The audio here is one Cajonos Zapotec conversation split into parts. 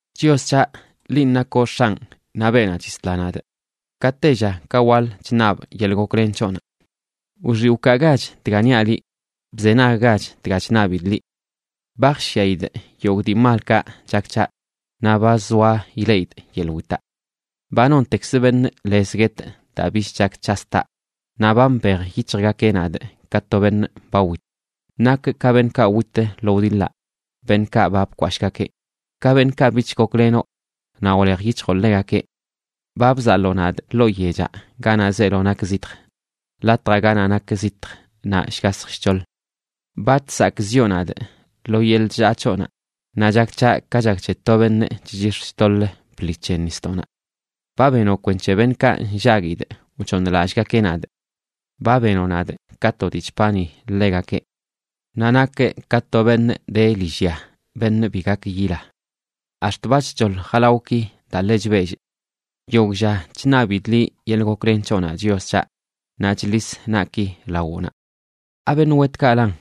Chios c̱haꞌ, linꞌ nakoꞌ X̱anꞌ naꞌ beenaꞌ chisla nadꞌ, ka tella ka waḻ chṉabꞌ yeḻꞌ goklen c̱hoꞌnaꞌ. ¡Wxiꞌ wkaagach dga niaꞌ liꞌ!, ¡bzenaggach dga chṉabidꞌ liꞌ! Ba jshyaidꞌ yogꞌ dii malkaꞌ chak c̱haꞌ, naꞌ ba zoa ileꞌidꞌ yeḻꞌ witaꞌ. ¡Ba nontekz beṉꞌ lez guetꞌ, daa bich chak c̱has taꞌ! Naꞌ ba mbej yic̱hjgakeꞌ nadꞌ ka to beṉꞌ ba wit; nakꞌ ka beṉꞌkaꞌ wit lo wdiḻaꞌ beṉꞌkaꞌ ba bkwashꞌgakeꞌ; ka beṉꞌkaꞌ bich goklenoꞌ naꞌ wlej yic̱hjoꞌ ḻegakeꞌ. Ba bzaḻoo nadꞌ ḻoo yechaꞌ ganaꞌ zeelo nak zitj, latjaꞌ ganaꞌ nak zitj naꞌ shgashj shc̱hoḻ. Ba chsakꞌziꞌo nadꞌ lo yeḻꞌ chllaa c̱hoꞌnaꞌ, naꞌ chak c̱haꞌ ka chak c̱he to beṉꞌ chchix̱ chtoḻ bḻi c̱he nisdoꞌnaꞌ. Ba benoꞌ kwenc̱he beṉꞌkaꞌ nllaguidꞌ wchooṉlallꞌgakeꞌ nadꞌ; ba benoꞌ nadꞌ ka to dii chpani ḻegakeꞌ. Naꞌ nakꞌ ka to beṉꞌ de lillya beṉꞌ bi gak yila. Ax̱t ba chc̱hoḻ jalawꞌki daa ḻe chbellꞌ. ¡Yogꞌ lla chṉabidꞌ liꞌ yeḻꞌ goklen c̱hoꞌnaꞌ, Chios c̱haꞌ, naꞌ chḻis naꞌki lawoꞌnaꞌ! ¿Abeṉꞌ wetkaꞌlan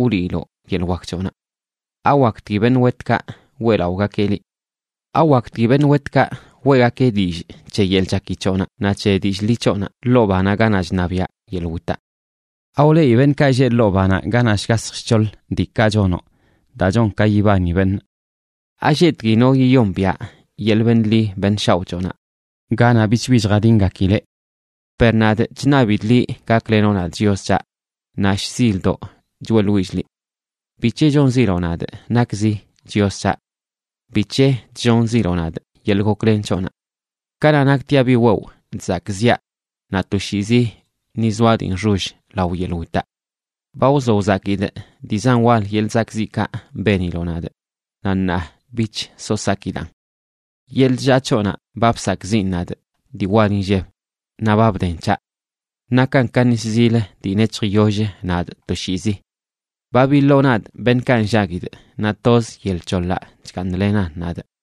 wliiloꞌ yeḻꞌ wak c̱hoꞌnaꞌ? ¿Awaktgui beṉꞌ wetkaꞌ weꞌlaꞌogakeꞌ liꞌ? ¿Awaktgui beṉꞌ wetkaꞌ weꞌgakeꞌ dillꞌ c̱he yeḻꞌ chaki c̱hoꞌnaꞌ naꞌ c̱he dillꞌ ḻi c̱hoꞌnaꞌ ḻoo banaꞌ ganaꞌ chṉabiaꞌ yeḻꞌ witaꞌ? ¿Awleꞌi beṉꞌkaꞌ lleꞌ ḻoo banaꞌ, ganaꞌ shgasj shc̱hoḻ, diikaꞌ chonoꞌ daa chon ka yibani beṉꞌ? ¿Alleꞌtgui no yiyombiaꞌ yeḻꞌ beṉꞌ ḻi beṉꞌ shaoꞌ c̱hoꞌnaꞌ, ganaꞌ bichbi chjadingakileꞌ? Per nadꞌ, chṉabidꞌ liꞌ gaklenoꞌ nadꞌ, Chios c̱haꞌ; naꞌ shzildoꞌ choeꞌḻwillꞌ liꞌ. ¿Bic̱he chonziloꞌ nadꞌ nakzi, Chios c̱haꞌ? ¿Bic̱he chllonziloꞌ nadꞌ yeḻꞌ goklen c̱hoꞌnaꞌ? Kanaꞌ naktiaꞌ bi wewꞌ chzakꞌziꞌa, naꞌ toshiizi ni zoaꞌ dii nxoll lao yeḻꞌ witaꞌ. Ba wzo wzakidꞌ dii zan wal yeḻꞌ zakꞌziꞌkaꞌ beniloꞌ nadꞌ, naꞌ ṉaa bich so sakidaꞌn. Yeḻꞌ chllaa c̱hoꞌnaꞌ ba bsakꞌziꞌn nadꞌ dii wal inlleb, naꞌ ba bden c̱haꞌ. Nakan ka nis zil dii nec̱hj yoll nadꞌ toshiizi. Ba biḻoo nadꞌ beṉꞌkaꞌ nllaguidꞌ, naꞌ toz yel c̱holaꞌ chgaaṉlenan nadꞌ.